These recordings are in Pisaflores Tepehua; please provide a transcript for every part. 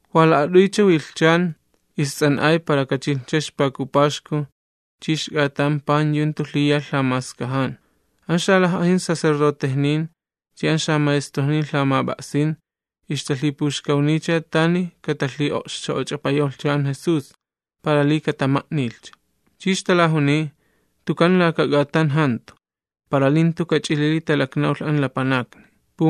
Wa la'at'uycha wilhchani ists'an'ay para kachilhcha ixpaku paxku chi ixk'atan pan yu jantu lhiyalh lhamaskajan. An xalaj'ajin sacerdotejnin chi an xamaestrojnin lhamap'a'sin ixtalhipuxkawniycha tani katalhi'o'xcho'och'apayawlhcha an Jesús, para li katama'nilhcha. Chi ixtalajuniy: ―Tukan laka k'atan jantu, para li jantu kach'ilili talaknawlh an lapanakni.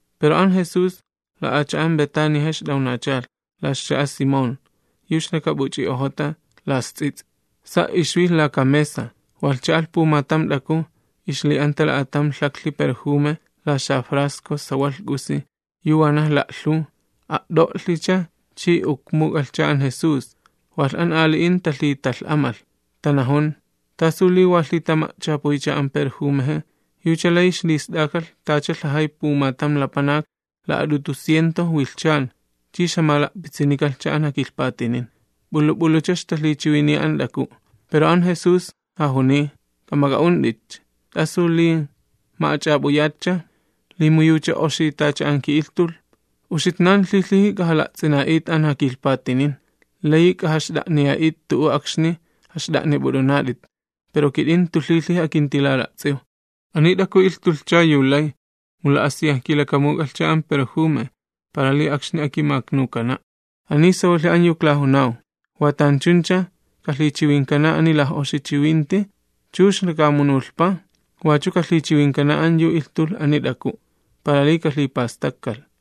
Pero an Jesús, la'acha'an Betaniaja ixt'awnachalh, la ixcha'a Simón, yu ixlakap'uch'i'ojota la ixts'its'i, sa' ixwilh laka mesa. Walh cha'alh pumatam t'aku ixli'anta la'atam lhaklhi perjume la xafrasco sawalh k'usi, yu wanaj la'lhuw, a't'olhicha chi ukmuk'alhcha an Jesús. Walh an ali'in talhitalh'amalh, tanajun: ―¿Tasu li wa lhitama'chapuycha an perjumeje? Yucha layi ixlist'akalh tacha lhajay pumatam lapanak la'at'utu ciento wilhchan chi ixjamala'pitsinikalhcha an jakilhpatinin. P'ulu p'ulucha ixtalhichiwiniya an t'aku'. Pero an Jesús jajuniy: ―K'amak'a'unt'itcha. ¿T'asu li ma'ach'ap'uyatcha?, li mu yucha oxi tacha an ki'ilhtulh. Uxitnan lhilhiji k'ajat'a'aklats'uk'uya'it'it an jakilhpatinin, layi k'ajaxt'a'niya'it tu'u akxni jaxt'a'nip'ut'unat'it, pero kit'in jantu lhilhiji akintilat'a'aklatsukuw. Ani t'aku ilhtulhcha yu lay, mu la'asiyaj kilakamuk'alhcha an perjume para li akxni akimaknukana'. Ani sawalhi an yu klajunaw, watanchuncha kalhichiwinkana ani laj'oxi chiwinti, chux lakamunulhpa, wachu kalhichiwinkana an yu ilhtulh ani t'aku', para li kalhipastakkalh.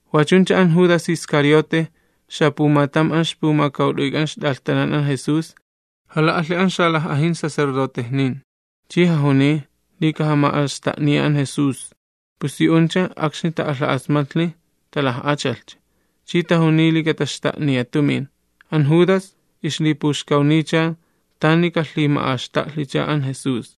Wachuncha an Judas Iscariote, xapumatam an ixpumakawt'uyk'an ixt'alhtanan an Jesús, jala'alhi an xalaj'ajin sacerdotejnin, chi jajuniycha li kajama'axta'niya an Jesús. Pus yu'uncha akxni ta'alha'asmatlhi talaj'achalhcha, chi tajuniy li kataxta'niya tumin. An Judas ixlipuxkawniycha tani kalhima'axta'lhicha an Jesús.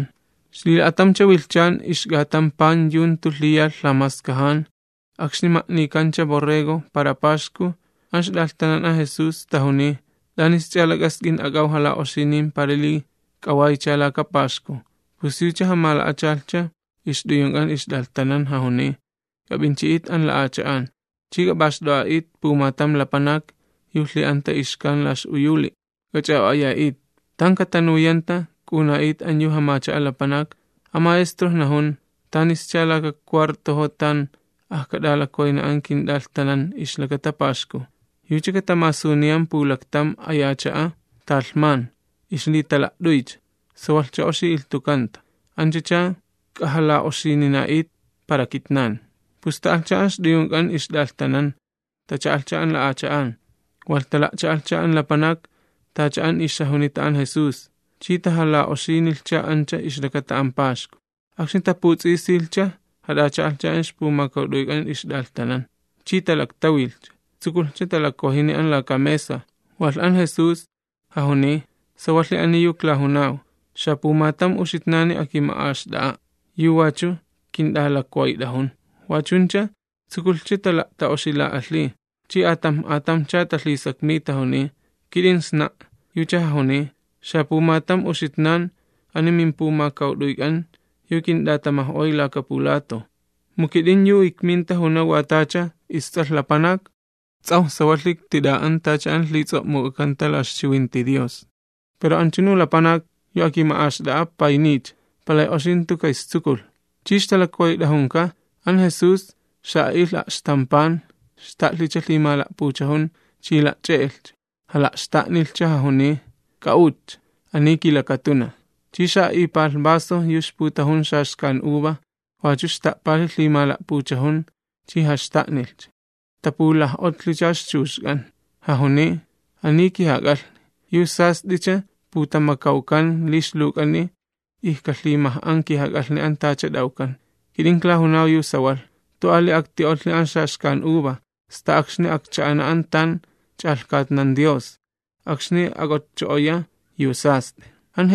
Xlila'atamcha wilhchan ixk'atan pan yu jantu lhiyalh lhamaskajan, akxni ma'nikancha jas'at'a borrego para paxku, an ixt'alhtanan an Jesús tajuniy: ―¿T'anisch'a lak'ask'in ak'aw jala'oxinin para li k'awaycha laka paxku? Pus yucha jamala'achalhcha ixt'uyunk'an ixt'alhtanan, jajuniy: ―K'ap'inchi'it an la'acha'an, ch'i k'ap'axt'o'a'it pumatam lapanak yu lhi'anta ixkan la ix'uyuli', k'ach'a'o'aya'it. Tan katanuyanta k'a'una'it an yu jamacha'a lapanak: An maestro najun: “¿Tanischa laka cha'a tan ajkat'alakwayna an kint'alhtanan ixlakata Paxku?” Yucha katamasuniyan pulaktam aya cha'a talhman ixlitala't'uycha, sawalhcha oxi ilhtukanta, anch'ach'a k'ajala'oxinina'it para kitnan. Pus ta'alhcha an ixt'uyunk'an ixt'alhtanan. Tacha'alhcha an la'acha'an, walh tala'cha'alhcha an lapanak, tacha an ixjajunita an Jesús, chi tamala'asijnilhcha ancha ixlakata an paxku. Akxni taputs'isilhcha jat'acha'alhcha an ixpumakawt'uyk'an ixt'alhtanan, chi talaktawilhcha, tsukulhcha talakwajini an laka mesa, walh an Jesús jajuniy: ―Sawalhi ani yu aklajunaw, xapumatam yu uxitnani akima'axt'a'a', yu wachu kint'alakwayt'ajun. Wachuncha tsukulhcha tala'ta'oxila'alhiy, chi atamj atamjcha talhisakmiy, tajuniy: ―¿Kit'in sna'? Yucha jajuniy: ―Xapumatam uxitnan ani mimpumakawt'uyk'an, yu kint'atamaj'oy laka pulatoj. Sawalhi li an isTs'alh Lapanak ts'ajwi ti'an, tacha an lhits'o'muk'akanta, pero an lapanak an yu kama'axt'a'a an isTs'alh Lapanak kapulhik'atsaya'. Yucha palay oxi jantu ka'istsukulh. Chi ixtalakwayt'ajunka, an Jesús xa'a'ilh a'xtam pan, xta'lhicha lhimala'puchajun chi la'ch'e'elhcha, jala'xta'nilhcha, jajuniy: ―K'a'utcha, ani kilakatunaj. Chi xa'a'ipalh vaso yu ixputajun xaxkan uva, wachu xta'palhi lhimala'puchajun, chi jaxta'nilhcha, tapulaj'otlhicha ixchuxk'an. Jajuniy: ―Ani kijak'alhni, yu sast'icha putamakawkan li ixluwk'ani ijkalhimaj'an kijak'alhni an tacha t'awkan. Kit'in klajunaw yu sawalh, jantu ali akti'otlhi an xaxkan uva, sta akxni akcha'ana an tan ch'alhkatnan Dios, akxni ak'otcho'oya yu sast'i.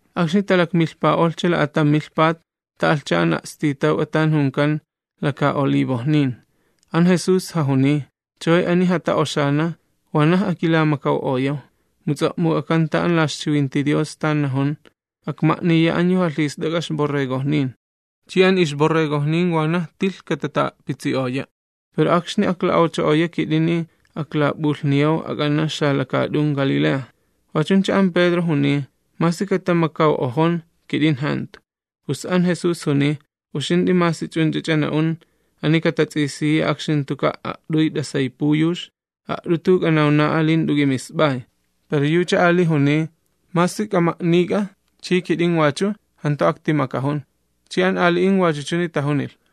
Akxni talakmilhpa'olhcha la'atam milhpat, ta'alhcha an a'stitawk'a tan junkan Laka Olivojnin. An Jesús jajuniy: ―Chaway ani jata'oxana wanaj akilamakaw'oyaw, mu ts'o'muk'akanta an la ixchiwinti Dios tan najun: “Akma'niya an yu jalhist'ak'a ixborregojnin, chi an ixborregojnin wanaj tilh katata'a'pitsi'oya'.” Pero akxni akla'awcho'oya kit'ini aklatap'ulhniyaw ak'ana xalakaat'un Galilea. Wachuncha an Pedro juniy: ―Masi katamakaw'ojon, kit'in jantu. Pus an Jesús juniy: ―Kit'in sawalhi yu ijkunan, ani katats'isiya akxni jantuka' a't'uy t'asay puyux, a't'utu k'anawna'a li jant'u k'imisp'ay. Pero yucha ali juniy: ―Masi k'ama'nik'a chi kit'in wachu, jantu aktimakajun. Chi an ali'in wachu chuni tajunilh.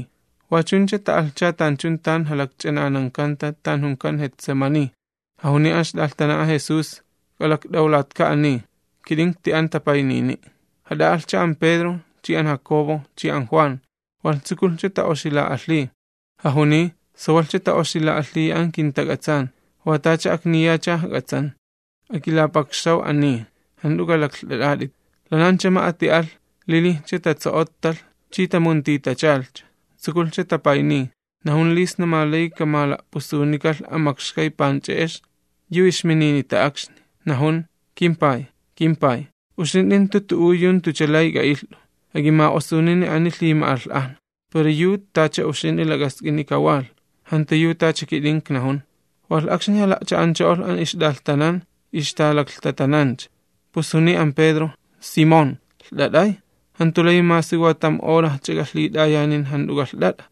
Wachuncha ta'alhcha tanchun tan jalakch'ananankanta tan junkan Getsemaní, jajuniy an ixt'alhtanan an Jesús: ―K'alakt'awlatka ani, kit'in ikti'an tapaynini'. Ja'aylhi'alhcha an Pedro chi an Jacobo chi an Juan, walh tsukulhcha ta'oxila'alhiy. Jajuniy: ―Sawalhcha ta'oxila'alhiya an kintak'atsan, wa tacha akniyacha ijk'atsan. Akilapakxaw ani, jant'u k'alaklht'at'at'it. Lanancha ma'ati alh, lilijcha tatso'ottalh chi tamuntitachalhcha, tsukulhcha tapayniy, najun li sna ma layi kamala'pusunikalh an makxkay panch'e'ex yu ixmininita akxni. Najun: ―KimPay, kimPay, uxint'i jantu tu'u yu jantucha lay k'a'ilht'u. Ak'imala'xt'inunini ani ay lhima'alh'ajna, pero yu tacha uxint'i lak'ask'ini kawalh, jantu yu tacha kit'in iknajun. Walh akxni jala'cha'ancho'olh an ixt'alhtanan, ixtalaklhtatanancha, pus juniy an Pedro: ―Simón, ¿lht'at'ay? ¿Jantu layi masi wa tamcha hora ak'int'a'alhk'ujt'i?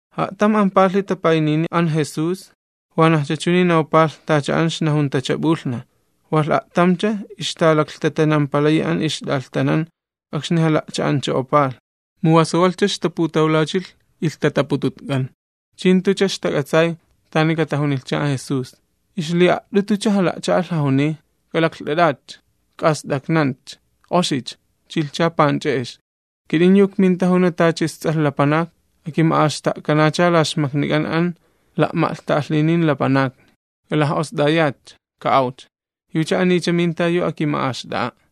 A'tam ampalhi tapaynini an Jesús, wanajcha chuni nawpalh tacha an ixnajuntacha p'ulhnaj. Walh a'tamcha ixtalaklhtatanampalayi an ixt'alhtanan akxni jala'cha'ancho'opalh, mu wa sawalhcha ixjala'cha'an ilhtatapututk'an, chi jantucha ixtak'atsay tani katajunilhcha an Jesús. Ixli'a't'utucha jala'cha'alh jajuniy: ―¿Jast'aknant'awnatka ch'i laklht'at'ayatka'? Chilhcha panch'e'ex, an isTs'alh Lapanak kama'axta'kanacha la xmaknik'an an la'ma'lhta'alhinin. K'alaj'ost'ayatcha, ka'awcha, jo' mintacha an yu akima'axt'a'a'.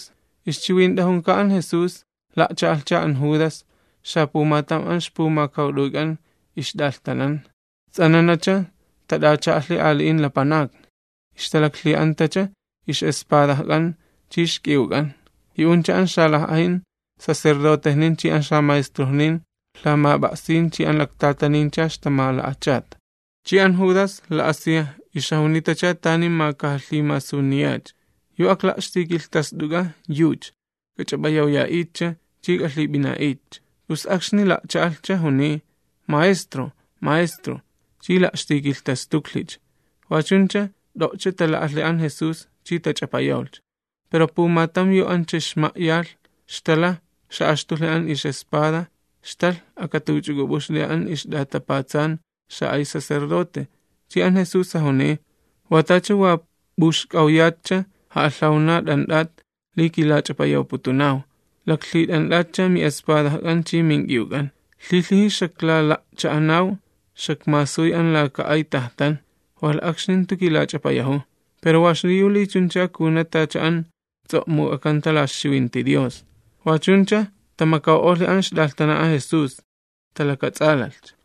Ixchiwint'ajunka an Jesús, la'cha'alhcha an Judas, xapumatam an ixpumakawt'uyk'an ixt'alhtanan, ts'ananacha tat'acha'alhi ali'in lapanakni, ixtalaklhi'antacha ix'espadajk'an chi ixk'iwk'an. Yu'uncha an xalaj'ajin sacerdotejnin chi an xamaestrojnin lhamap'a'sin chi an laktatanini ixtamala'achata. An ja'o'xcho'onuj Judas la'asiyaj ixjajunitacha tani kajapumasuniyacha, ixjajunita: ―Yucha an akla'xtikilhtast'uk'a yu Jesús, k'ach'ap'ayawya'itcha chi k'alhip'ina'itcha. Pus akxni la'cha'alhcha, juniy: ―Maestro, maestro. Chi la'xtikilhtastuklhicha. Wachuncha t'o'cha tala'alhi an Jesús chi tach'apayawlhcha. Pero pumatam yu ancha ixma'yalh, xtalaj xa'axtulhi an ix'espada, xtalh akatuch'uk'up'uxli an ixma'tsuku xa'ay sacerdote. Chi an Jesús jajuniy: ―Wa t'ach'a wa p'uxk'awyatcha ja'alhawna t'ant'at li kilach'apayawputunaw, laklhit'ant'atcha mi'espadajk'an chi mink'iwk'an. Lhilhiji xaklala'cha'anaw xakmasuy an laka ay tajtan, walh akxni jantu kilach'apayajuw, pero wa xliyu li chuncha kajuna tacha an ts'o'muk'akanta la ixchiwinti Dios. Wachuncha tamakaw'olhi an ixt'alhtanan an Jesús, talakats'alalhcha.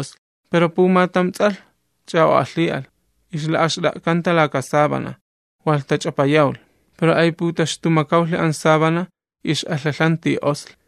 Pero pumatam ts'alh ch'a'o'alhi'alh, ixla'axt'a'kanta laka sábana, walh tach'apayawlh, pero ayputaxtumakawlhi an sábana, ix'alhalhanti osli.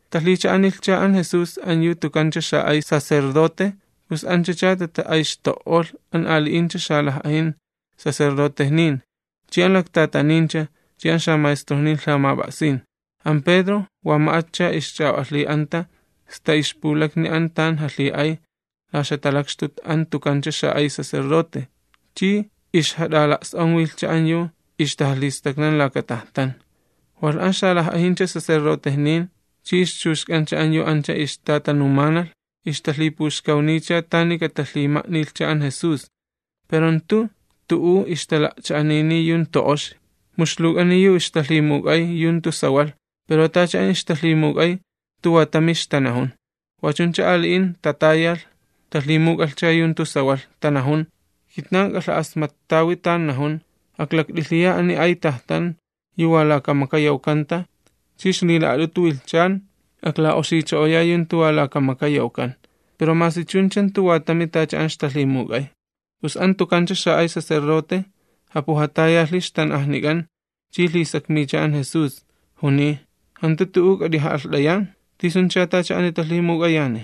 Talhicha'anilhcha an Jesús an yu tukancha xa'ay sacerdote, pus anchacha tata'ayxto'olh an ali'incha xalaj'ajin sacerdotejnin, chi an laktatanin, chi an xamaestrojnin lhamap'a'sin. An Pedro wa ma'atcha ixch'a'o'alhi'anta sta ixpulakni an tan jalhi'ay la ixjatalakxtut an tukancha xa'ay sacerdote, chi ixjat'ala's'onwilhcha an yu ixtajalhistaknan laka tajtan. Walh an xalaj'ajincha sacerdotejnin chi ixchuxk'ancha an yu ancha ixtatanumanalh, ixtalhipuxkawniycha tani katalhima'nilhcha an Jesús, pero jantu tu'u ixtala'cha'aniniy yu jantu oxi. Mu ixluwk'ani yu ixtalhimuk'ay yu jantu sawalh, pero tacha an ixtalhimuk'ay jantu wa tami ixtanajun. Wachuncha ali'in tatayalh, talhimuk'alhcha yu jantu sawalh, tanajun: ―Kitnan ik'alha'asmattawi tan najun: “Aklakt'ilhiya ani ay tajtan yu wa laka maka yawkanta, chi ixlila'at'utu wilhchan akla'oxicho'oya yu jantu wa laka maka yawkan.” Pero masi chuncha jantu wa tami tacha an ixtalhimuk'ay. Pus an tukancha xa'ay sacerdote japujatayalhi ixtan'ajnik'an, chi lhisakmiycha an Jesús, juniy: ―¿Jant'u t'u'u k'at'ija'alht'ayan? ¿Tisuncha tacha ani talhimuk'ayani?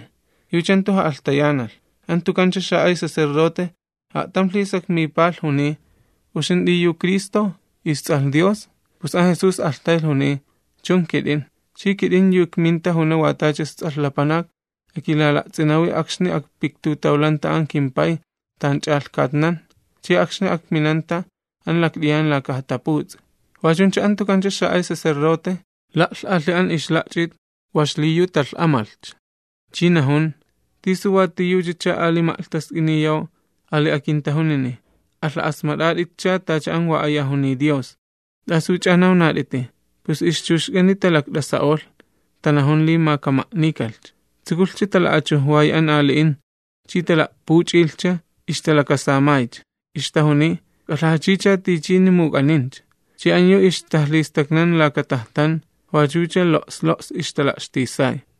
Yucha jantu ja'alhtayanalh. An tukancha xa'ay sacerdote a'tam lhisakmipalh, juniy: ―¿Uxint'i yu Cristo, isTs'alh Dios? Pus an Jesús alhtaylh juniy: ―Chun, kit'in. Chi kit'in yu ikminta juna wa tacha isTs'alh Lapanak akilala'ts'inawi akxni akpiktutawlanta an kimPay tan ch'alhkatnan, chi akxni akminanta an lakt'iyan laka jataputs'i. Wachuncha an tukancha xa'ay sacerdote, la'lh'alhi an ixla'ch'it wa xliyu talh'amalhcha, chi najun: ―¿Tisu wa tiyuchacha ali ma'lhtask'iniyaw ali akintajunini? Alha'asmat'at'itcha tacha an wa aya juniy Dios. ¿T'asuch'a nawnat'iti? Pus ixchuxk'ani talakt'asa'olh, tanajun li ma kama'nikalhcha. Tsukulhcha tala'achujwayi an ali'in, chi tala'puch'ilhcha, ixtalakasamaycha, ixtajuniy: ―¡K'alhajachicha tichini muk'anincha! Chi an yu ixtajalhistaknan laka tajtan wachucha lo's lo's ixtala'xtisay.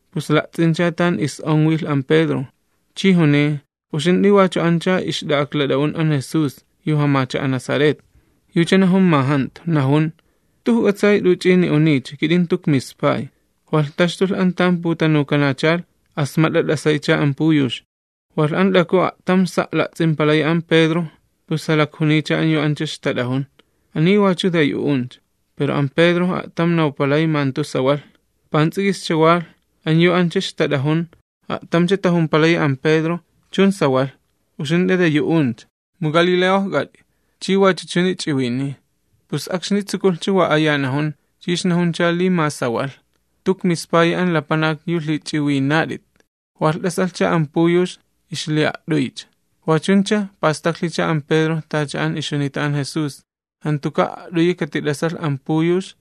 pus la'ts'incha tan is'onwilh an Pedro, chi juniy: ―Uxint'i wach'u anch'a ixt'a'aklat'a'un an Jesús yu jamacha'a Nazaret. Yucha najun ma jantu, najun: ―Jantu ijk'atsay t'uch'ini uniycha, kit'in jantu ikmispay. Walh taxtulh an tan putanukanachalh, asmat'a t'asaycha an puyux. Walh an t'aku a'tam sa' la'ts'impalayi an Pedro, pus jalakjuniycha an yu ancha ixtat'ajun: ―Ani wachu de yu'uncha. Pero an Pedro a'tam nawpalay ma jantu sawalh. Pants'ik'ischa walh, an yu ancha ixtat'ajun a'tamcha tajumpalayi an Pedro: ―Chun sawalh, uxint'i de yu'uncha, mu uxint'i jamacha'a Galilea, ch'i wach'u ch'uni ch'iwiniy. Pus akxni tsukulhcha wa aya najun, chi ixnajuncha li ma sawalh: ―Jantu ikmispayi an lapanak yu lhich'iwinat'it. Walh t'asalhcha an puyux ixli'a't'uycha, wachuncha pastaklhicha an Pedro tacha an ixjunita an Jesús: “Jantuka' a't'uyi katit'asalh an puyux,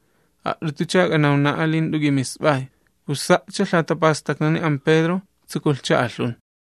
a't'utucha k'anawna'a li jant'u k'imisp'ay.” Pus sa'cha lhatapastaknani an Pedro, tsukulhcha alhun.